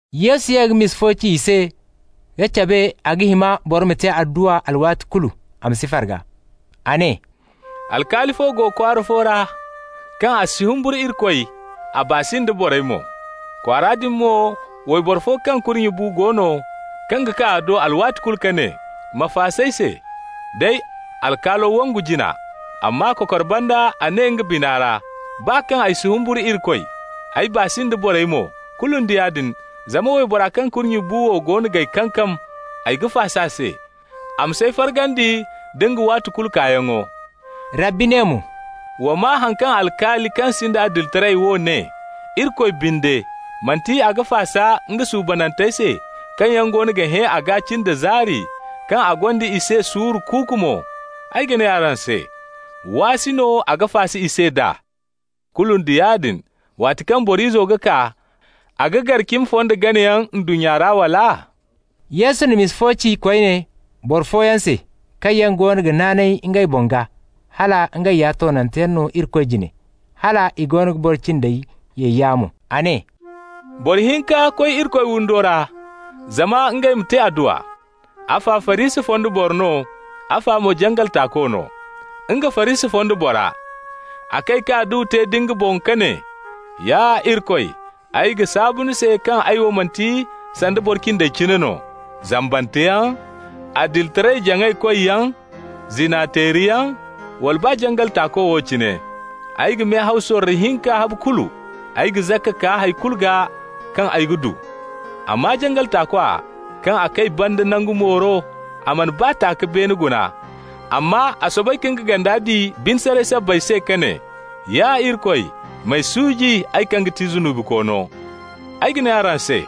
Yesu ye ka misa fo ci i se ka cabe a ga hima boro ma te adduwa alwaati kulu, a ma si farga. A ne: «Alkaali fo go kwaara fo ra, kaŋ a si humburu Irikoy, a baa si nda borey mo. Kwaara din mo wayboro fo kaŋ kurnye bu go no kaŋ ga kaa a do alwaati kulu ka ne: ‹Ma faas'ay se.› Day alkaalo wangu jina. Amma kokor banda a ne nga bina ra: ‹Baa kaŋ ay si humburu Irikoy, ay baa si nda borey mo, kulu nda yaadin, zama waybora kaŋ kurnye bu wo goono g'ay kankam, ay ga faas'a se, a ma s'ay fargandi nda nga waati kulu kaayaŋo.›» Rabbi ne mo: «Wa maa haŋ kaŋ alkaali kaŋ sinda adilitaray wo ne. Irikoy binde, manti a ga faasa nga suubanantey se, kaŋ yaŋ goono ga hẽ a gaa cin da zaari, kaŋ a gonda i se suuru kuuku mo? Ay ga ne araŋ se: waasi no a ga faasa i se d'a. Kulu nda yaadin, waati kaŋ Boro Izo ga kaa, a ga gar cimi fonda ganayaŋ ndunnya ra, wala?» Yesu na misa wo ci koyne boro fooyaŋ se kaŋ yaŋ goono ga naanay ngey boŋ gaa hal ngey ya toonanteyaŋ no Irikoy jine, hala i ga boro cindey ye yaamo. A ne: «Boro hinka koy Irikoy windo ra zama ngey ma te adduwa. Afa Farisi fonda boro no, afa mo jangal taako no. Nga, Farisi fonda bora, a kay ka adduwa te nda nga boŋ ka ne: ‹Ya Irikoy, ay ga saabu ni se kaŋ ay wo manti sanda boro cindey cine no -- zambanteyaŋ, adilitaray-jaŋay-koyyaŋ, zina-teeriyaŋ, wala baa jangal taako wo cine. Ay ga mehaw sorro hinka habu kulu, ay ga zakka kaa hay kulu gaa kaŋ ay ga du.› Amma jangal taakwa, kaŋ a kay banda nangu mooro, a mana baa ta ka beene guna, amma a soobay ka nga ganda di bine saray sabbay se ka ne: ‹Ya Irikoy, m'ay suuji, ay kaŋ ga ti zunubikoono.› Ay ga ne araŋ se: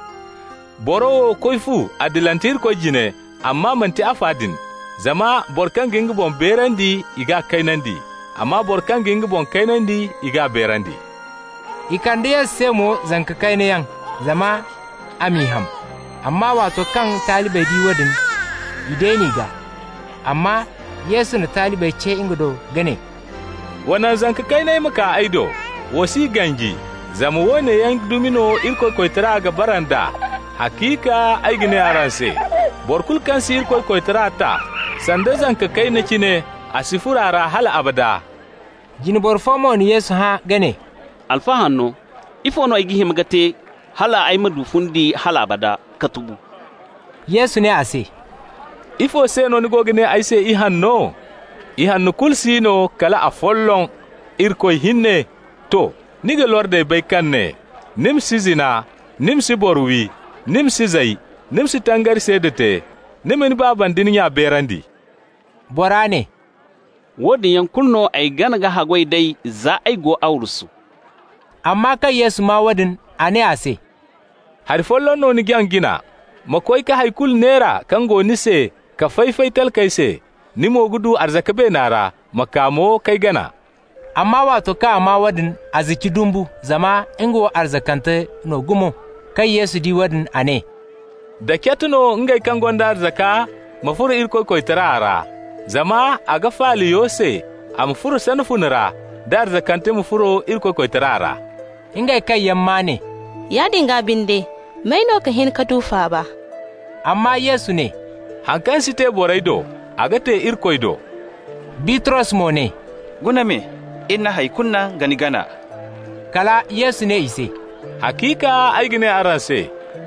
boro wo koy fu adilante Irikoy jine, amma manti afa din. Zama boro kaŋ ga nga boŋ beerandi, i g'a kaynandi. Amma boro kaŋ ga nga boŋ kaynandi, i g'a beerandi.» I kande Yesu se mo zanka kayna yaŋ, zama a m'i ham. Amma waato kaŋ talibey di woodin, i deen'i gaa. Amma Yesu na talibey ce nga do ka ne: «Wa naŋ zanka kayney ma kaa ay do. Wa s'i ganji, zama woone yaŋ dumi no Irikoy koytara ga bara nd'a. Haciika ay ga ne araŋ se: boro kulu kaŋ si Irikoy koytara ta sanda zanka kayna cine, a si furo a ra hal abada.» Jine boro fo mo na Yesu hã ka ne: «Alfa hanno, ifo no ay ga hima ka te hal ay ma du fundi hal abada ka tubu?» Yesu ne a se: «Ifo se no ni ga ne ay se ihanno? Ihanno kulu si no kal afolloŋ, Irikoy hinne. To. Ni ga lordey bay kaŋ ne: ‹Ni ma si zina, ni ma si boro wi, ni ma si zay, ni ma si tangari seeda te, ni ma ni baaba nda ni nya beerandi.›» Bora ne: «Woodin yaŋ kulu no ay gana ka haggoy d'ey za ay go arwasu.» Amma kaŋ Yesu maa woodin, a ne a se: «Hari folloŋ no ni jaŋ jina. Ma koy ka hay kulu neera kaŋ go ni se ka fay-fay talkey se -- ni mo ga du arzaka beena ra. Ma kaa mo k'ay gana.» Amma waato kaŋ a maa woodin, a zici dumbu zama nga wo arzakante no gumo. Kaŋ Yesu di woodin, a ne: «Da cat no ngey kaŋ gonda arzaka ma furo Irikoy koytara ra! Zama a ga faala yo se a ma furo sana fune ra, da arzakante ma furo Irikoy koytara ra.» Ngey kaŋ yaŋ maa ne: «Yaadin gaa binde, may no ga hin ka du faaba?» Amma Yesu ne: «Haŋ kaŋ si te borey do, a ga te Irikoy do.» Bitros mo ne: «Guna me, iri na hay kulu naŋ ka ni gana.» Kala Yesu ne i se: «Haciika ay ga ne araŋ se: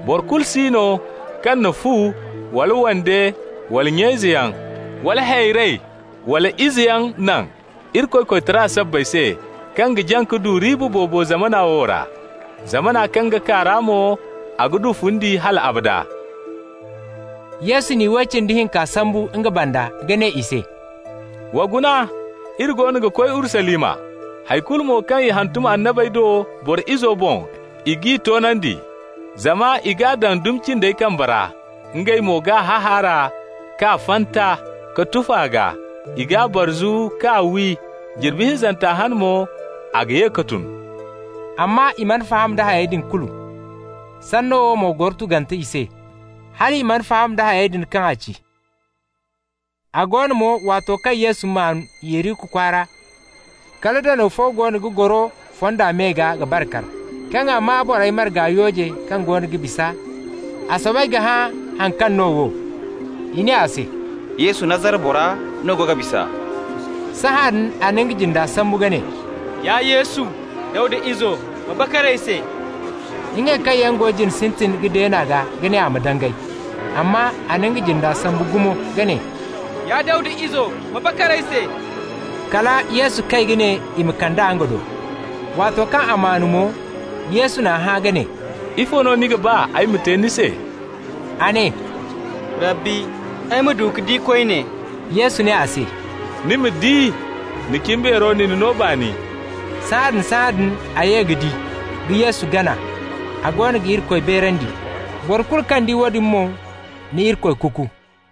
boro kulu si no kaŋ na fu, wala wande, wala nya-izeyaŋ, wala hayrey, wala izeyaŋ naŋ, Irikoy koytara sabbay se, kaŋ ga jaŋ ka du riiba boobo zamana wo ra. Zamana kaŋ ga kaa ra mo, a ga du fundi hal abada.» Yesu na iway cindi hinka sambu nga banda ka ne i se: «Wa guna, iri goono ga koy Urusalima. Hay kulu mo kaŋ i hantum annabey do Boro Izo boŋ, i g'i toonandi. Zama i g'a daŋ dumi cindey kambey ra. Ngey mo g'a hahaara k'a fanta, ka tufa a gaa, i g'a barzu k'a wi. Jirbi hinzanta hane mo a ga ye ka tun.» Amma i mana faham da hayey din kulu. Sanno wo mo goro tugante i se, hal i mana faham da hayey din kaŋ a ci. A go no mo, waato kaŋ Yesu maan Yeriko kwaara, kala danaw fo go ga goro fonda me gaa ga bar kar. Kaŋ a maa borey marga yooje kaŋ goono ga bisa, a soobay ka hã haŋ kaŋ no wo. I ne a se: «Yesu, Nazara bora no go ga bisa.» Sahãadin a na nga jinde sambu ka ne: «Ya Yesu, Dawda izo, ma bakar ay se!» Ngey kaŋ yaŋ go jina sintin ka deen'a gaa ka ne a ma dangay. Amma a na nga jinda sambu gumo, ka ne: «Ya Dawda izo, ma bakar ay se!» Kala Yesu kay ka ne i ma kand'a nga do. Waato kaŋ a maan mo, Yesu n'a hã ka ne: «Ifo no ni ga ba ay ma te ni se?» A ne: «Rabbi, ay ma du ka di koyne.» Yesu ne a se: «Ni ma di. Ni cimbeero na ni no baani.» Sahãadin-sahãadin a ye ka di, ka Yesu gana, a goono ga Irikoy beerandi. Boro kulu kaŋ di woodin mo na Irikoy kuku.